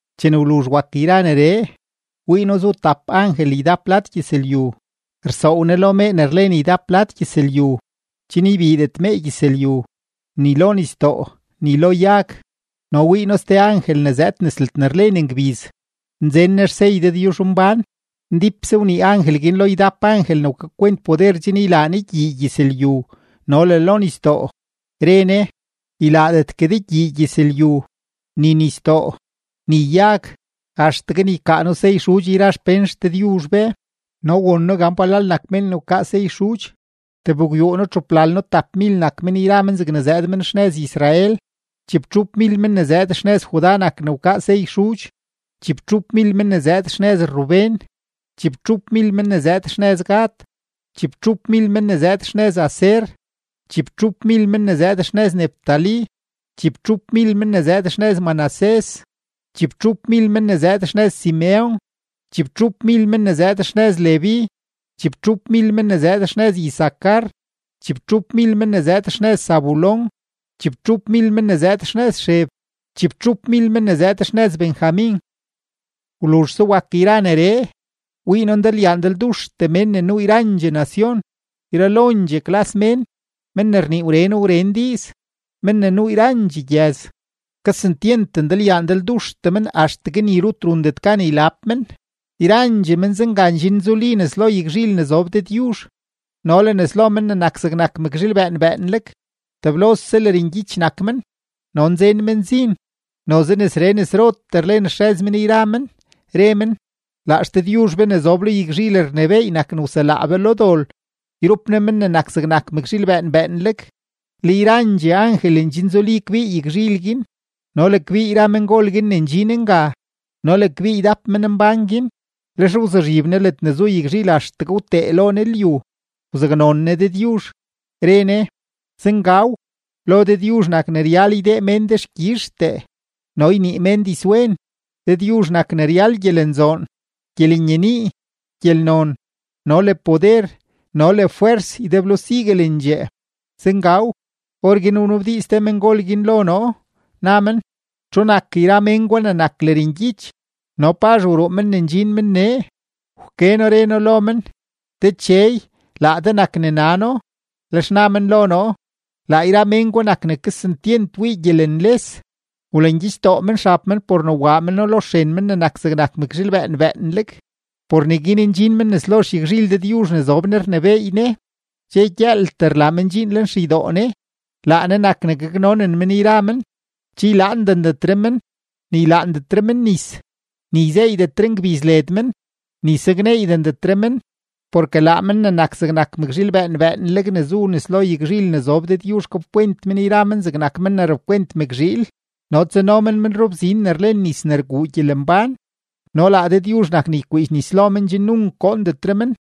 Chene wluzh wak yra neree, wii noo zu tap angel ydap lad gyëzlyu, rsoow ne lo mee ne rlen ydap lad gyëzlyu chen ybiidet mee gyëzlyu, ni lo nisdoo, ni lo yag. No wii noo ste angel ne zëëd nes ledne rlen ngbiz, nzen ne xsey Dëdyuzhmbán. Ndípse wnii angel guin lo ydap angel ne wkakwent poder chen ylaa ne gyii gyëzlyu no le lo nisdoo, re ne: ―Ylaadetgue de gyii gyëzlyu, ni nisdoo, ni yag axtegue ne ykaa noo sey xudx yra xpén XDëdyuzh be. No won noo gan palal nak mén ne wkaa sey xudx: tebgwyuuno-txuplalno-tapmil nak men yra men zegne zëëd men xnëz Israel. Chibtxupmil men ne zëëd xnëz Judá nak ne wkaa sey xudx, chibtxupmil men ne zëëd xnëz Rubén, chibtxupmil men ne zëëd xnëz Gad, chibtxupmil men ne zëëd xnëz Aser, chibtxupmil men ne zëëd xnëz Neftalí, chibtxupmil men ne zëëd xnëz Manasés, chibtxupmil men ne zëëd xnëz Simeon, chibtxupmil men ne zëëd xnëz Leví, chibtxupmil men ne zëëd xnëz Isacar, chibtxupmil men ne zëëd xnëz Zabulón, chibtxupmil men ne zëëd xnëz Xeb, chibtxupmil men ne zëëd xnëz Benjamin. Wluzhse wak yra neree, wii noo ndalyaa ndalduxtee mén ne nuu yrandxee nacion, yralondxee klas mén, men ne rnii wren wren diiz, men ne nuu yrandxee gyëz. Kesentyent ndalyaa ndalduxtee men axtegue ni rut rundet gan ylab men. Yrandxee men zenga ndxinzuli nes lo yagzhil ne zob Dëdyuzh no le nes lo Men ne nak zegnak mëkzhiil bëën bëënleg. Teblose lërngyich nak men no nzen men zin. Noze nesree nesrotee rlen xrëz men yra men, re men: Laa XDëdyuzh be ne zob lo yagzhil rnebééy nak ne wselaa be lo dol yrup Ne Men ne nak zegnak mëkzhiil bëën bëënleg. Le yrandxee angel ndxinzuli kbii yagzhil guin no le kbii yra mengol guin ne ndxin nga no le kbii ydap menmbán guin, lex wzuzhib ne ledne zu yagzhil axtegue wtee lo ne lyu, wzaknon ne Dëdyuzh, re ne: ¡Zengaw! Lo Dëdyuzh nak ne ryal ydee mén dexkyizhtee no ynii mén dizwen, Dëdyuzh nak ne ryal gyelenzoon, gyelenyenii, gyelnon, no le poder, no le fwers ydeblo siguelendxee. ¡Zengaw! Orguin wnabdiiz te mengol guin lo noo, na men: ―¿Txu nak yra men gwa ne nak lërngyich no pazh wruu men ne ndxin men nee? Wke noo, re noo lo men: ―Dechey, laa de nak ne nano. Lex na men lo noo: ―Laa yra men gwa nak ne kesentyent wii gyelenles; wlangyichdoo men xab men por ne waa meno lo xren Men ne nak zegnak mëkzhiil bëën bëënleg. Por neguin ndxin men nes lo xyagzhil Dëdyuzh ne zob Ne rnebééy Ne, dxe gyëëltee rlaa men dxiin lenxeydoo Ne; laa Ne nak ne gaknonen men yra men. Che ylaandendetre men, ni ylaandetre men nis, ni yzeeydetre ngbiz led men, ni sakneeydendetre men, porke laa Men ne nak zegnak mëkzhiil bëën bëënleg ne zu nes lo yagzhil ne zob Dëdyuzh gapkwent men yra men zegnak men ne rapkwent mëkzhiil no tsano men men rubzin ne rlen nis ne rguu gyelembán, no laa Dëdyuzh nak ne ykwiidx nis lo men chen nunk goondetre men.